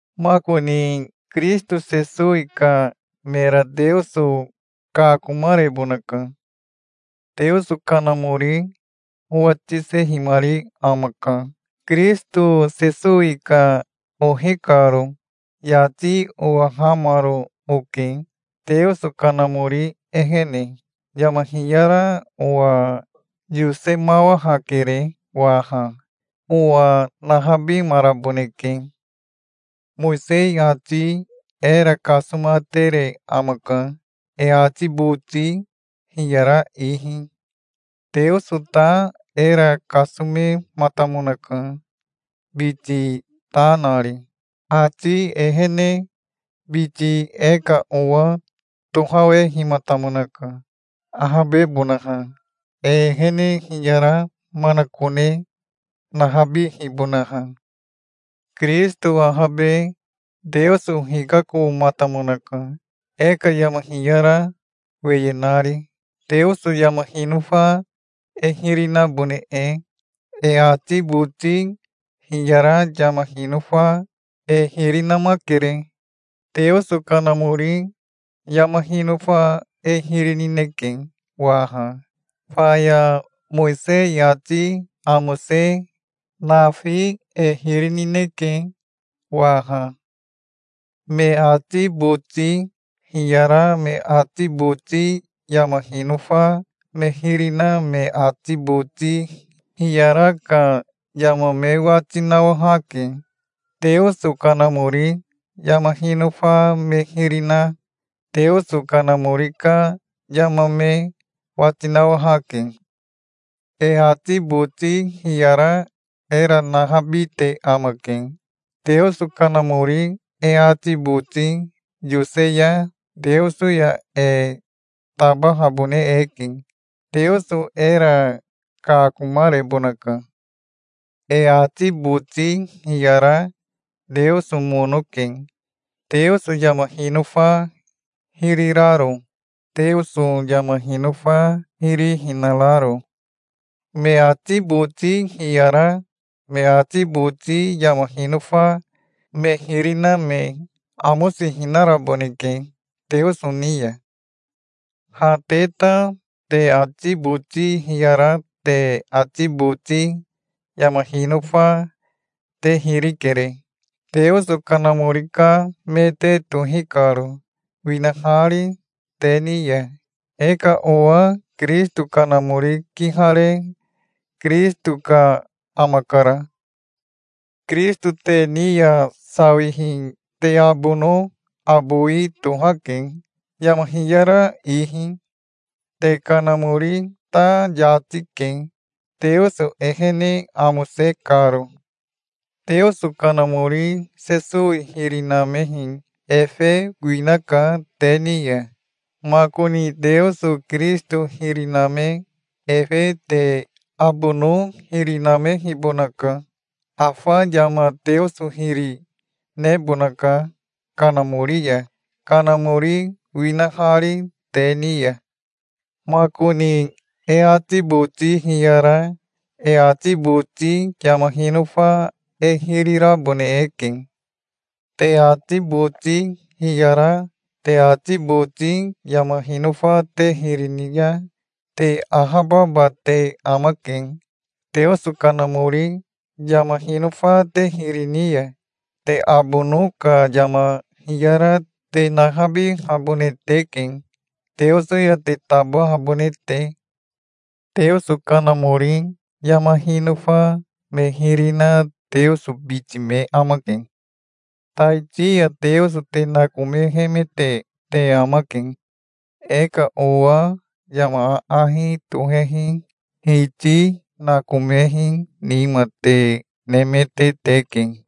Makoni Kirisito Sesowi ka mera Teoso kakomarebonaka. Teoso Kanamori owa tisehimari amaka, Kirisito Sesowi ka ohi karo. Yati owahamaro oke Teoso Kanamori ehene. Yama hiyara owa yosemawahakere waha. Owa nahabimaraboneke. Mowisei ati era kasomatere amaka, e ati boti hiyara ihi. Teoso ta era kasomematamonaka, biti ta nari. Ati ehene biti e ka owa tohawehimatamonaka, ahabebonaha, e ehene hiyara manakone nahabihibonaha. Kirisito ahabe Teoso hikakomatamonaka, e ka yama hiyara weye nari, Teoso yama hinofa e hiri nabone e. E ati boti hiyara yama hinofa e hiri namakere. Teoso Kanamori yama hinofa e hiri nineke waha. Faya Mowisei ati amose nafi e hiri nineke waha. Me ati boti hiyara me ati boti yama hinofa me hiri na me ati boti hiyara ka yama me wati nawahake. Teoso Kanamori yama hinofa me hiri na Teoso Kanamori ka yama me wati nawahake. E ati boti hiyara era nahabite amake. Teoso Kanamori e ati boti yose ya Teoso ya e tabahabone eke. Teoso era kakomarebonaka. E ati boti hiyara Teoso mono ke, Teoso yama hinofa hiri raro, Teoso yama hinofa hiri hinararo. Me ati boti hiyara me ati boti yama hinofa me hiri na me amosihinaraboneke Teoso ni ya. Ha te ta te ati boti hiyara te ati boti yama hinofa te hiri kere, Teoso Kanamori ka me te tohi karo, winahari te ni ya. E ka owa Kirisito Kanamori kihare Kirisito ka amakara. Kirisito te ni ya sawihi te abono abowi tohake, yama hiyara ihi. Te kanamori ta yati ke, Teoso ehene amose karo. Teoso Kanamori Sesowi hiri namehi efe winaka te ni ya. Makoni Teoso Kirisito hiri name efe te abono hiri namehibonaka. Afa yama Teoso hiri nebonaka Kanamori ya, Kanamori winahari te ni ya. Makoni e ati boti hiyara e ati boti yama hinofa e hiri rabone eke. Te ati boti hiyara te ati boti yama hinofa te hiri ni ya te ahababa te amake. Teoso Kanamori yama hinofa te hiri ni ya, te abono ka yama hiyara te nahabihabone teke, Teoso ya te tabahabone te. Teoso Kanamori yama hinofa me hiri na Teoso biti me amake. Taiti ya Teoso te nakomehemete te amake. E ka owa yama aahi tohehi hiti nakomehi nima te nemete teke.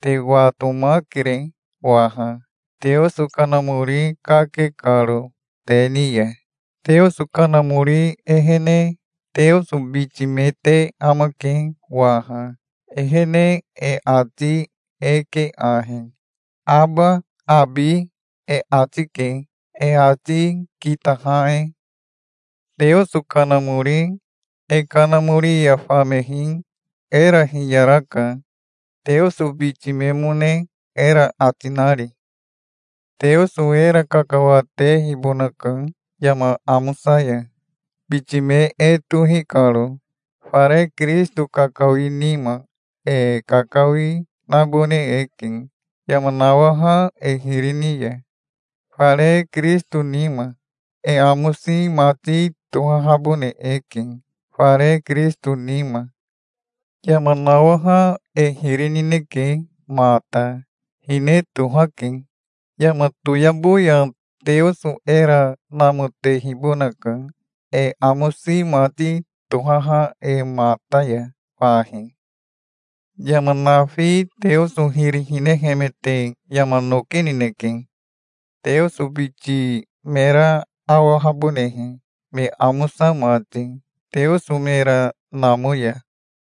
Te watomakere waha, Teoso Kanamori kake karo te ni ya. Teoso Kanamori ehene Teoso biti me te amake waha. Ehene e ati e ke ahi: "Aba, abi", e ati ke, e ati kitaha e. Teoso Kanamori e kanamori ya famehi era hiyaraka, Teoso biti memone era ati nari. Teoso era kakawatehibonaka yama amosa ya, biti me e tohi karo. Fare Kirisito kakawi nima e kakawi nabone eke, yama nawaha e hiri ni ya, fare Kirisito nima. E amosi mati tohahabone eke fare Kirisito nima. Yama nawaha e hiri nineke mata. Hine tohake. Yama toyabo ya Teoso era namotehibonaka e amosi mati tohaha e mata ya fahi. Yama nafi Teoso hiri hinehemete yama noki nineke, Teoso biti mera awahabonehe, me amosa mati, Teoso mera namo ya.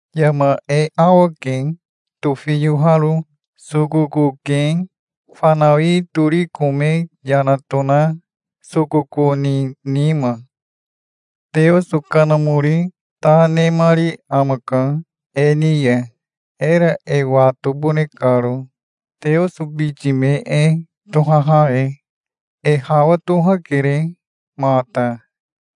Yama e awake, tofiyoaharo. Sokoko ke, fanawi tori kome yana tona sokoko ni nima. Teoso Kanamori ta nemari amaka e ni ya, era e watobone karo, Teoso biti me e tohaha e. E hawa tohakere mata.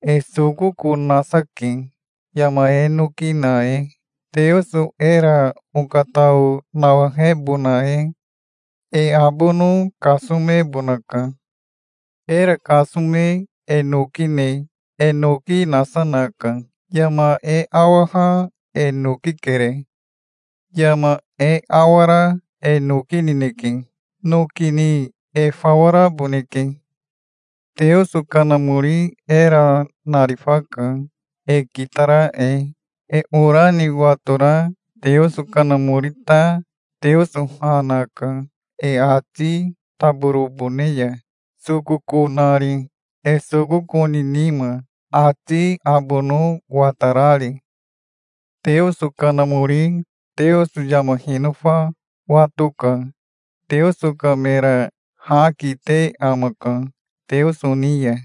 E sokoko nasa ke yama e noki na e, Teoso era okatao nawahebona e. E abono kasomebonaka. Era kasome e noki ne e noki nasa naka. Yama e awaha e noki kere. Yama e awara e noki nineke. Noki ni e fawa raboneke. Teoso Kanamori era narifaka, e kitara e. E ora ni watora Teoso Kanamori ta Teoso ha naka, e ati taborobone ya, sokoko nari, e sokoko ni nima, ati abono watarari. Teoso Kanamori Teoso yama hinofa wato ka Teoso ka mera ha kite amaka Teoso ni ya.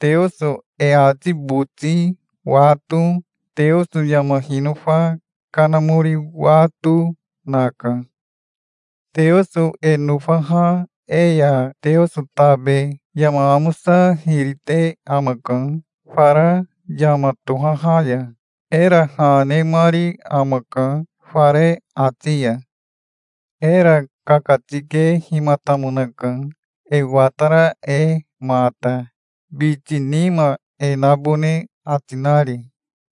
Teoso e ati boti wato Teoso yama hinofa Kanamori wato naka. Teoso e nofaha e ya Teoso tabe yama amosa hiri te amaka fara yama tohaha ya. Era ha nemari amaka fare ati ya. Era kakatikehimatamonaka e watara e mata, biti nima e nabone ati nari.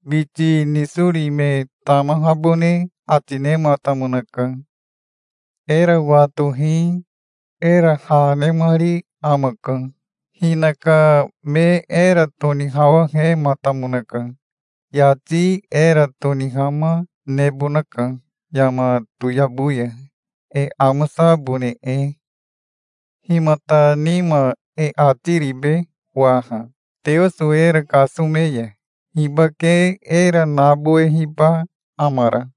Biti nisori me tamahabone ati nematamonaka. Era watohi era ha nemari amaka. Hinaka me era tonihawahematamonaka. Yati era tonihama nebonaka yama toyabo ya, e amosabone e. Himata nima e ati ribe waha? Teoso era kasome ya hibake era nabowehiba amara?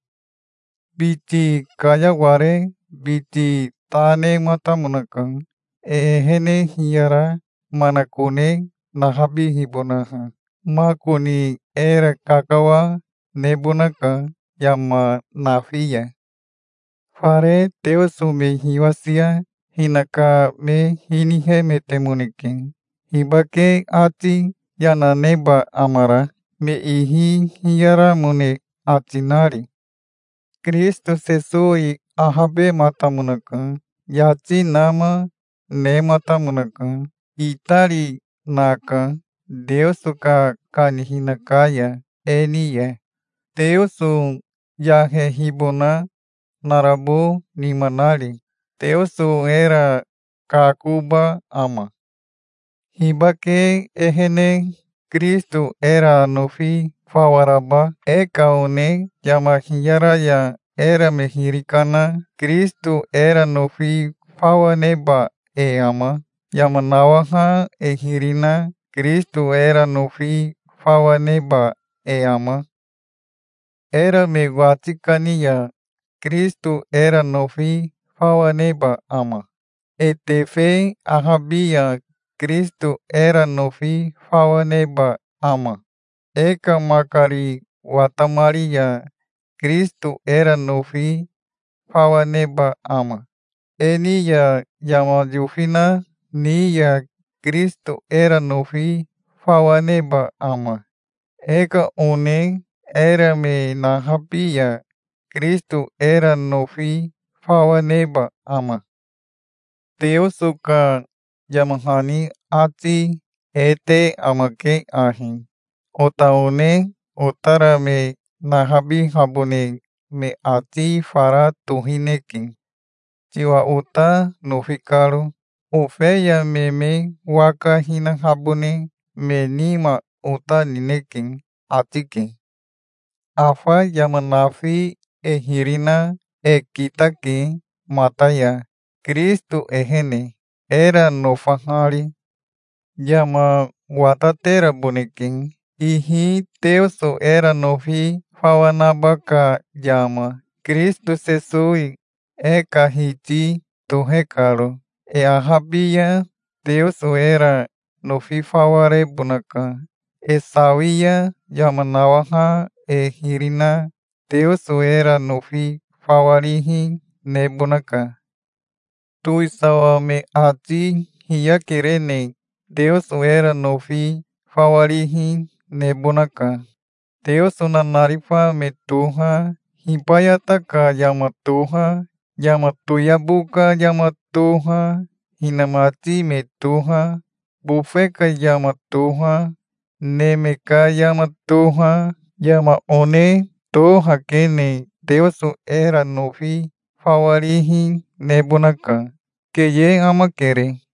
Biti kayaware biti ta nematamonaka, e ehene hiyara manakone nahabihibonaha. Makoni era kakawa nebonaka yama nafi ya. Fare Teoso me hiwasia hinaka me hinihemetemoneke. Hibake ati yana neba amara, me ihi hiyaramone ati nari? Kirisito Sesowi ahabematamonaka. Yati nama nematamonaka. Itari naka Teoso ka kanihina ka ya, e ni ya Teoso yahehibona narabo nima nari. Teoso era kakoba ama? Hibake ehene Kirisito era nofi fawa raba? E ka one yama hiyara ya era me hiri kana Kirisito era nofi fawa neba e ama? Yama nawaha e hiri na Kirisito era nofi fawa neba e ama? Era me wati kani ya Kirisito era nofi fawa neba ama? E tefe ahabi ya Kirisito era nofi fawa neba ama? E ka makari watamari ya Kirisito era nofi fawa neba ama? E ni ya yama yofina ni ya Kirisito era nofi fawa neba ama? E ka one era me nahabi ya Kirisito era nofi fawa neba ama? Teoso ka yama hani ati e te amake ahi: "Ota one otara me nahabihabone me ati fara tohineke, tiwa ota nofi karo. Ofeya me me waka hinahabone me nima ota nineke", ati ke. Afa yama nafi e hiri na e kitake mata ya Kirisito ehene, era nofahari. Yama watateraboneke, ihi Teoso era nofi fawa naba ka yama, Kirisito Sesowi e ka Hiti tohe karo. E ahabi ya Teoso era nofi fawa rebonaka. E sawi ya yama nawaha e hiri na Teoso era nofi fawa rihi nebonaka. Towisawa me ati hiyakerene Teoso era nofi fawa rihi nebonaka. Teoso nanarifa me toha, hibayata ka yama toha, yama toyabo ka yama toha, hinamati me toha, bofe ka yama toha, neme ka yama toha, yama one tohakene Teoso era nofi fawa rihi nebonaka. Keye amakere.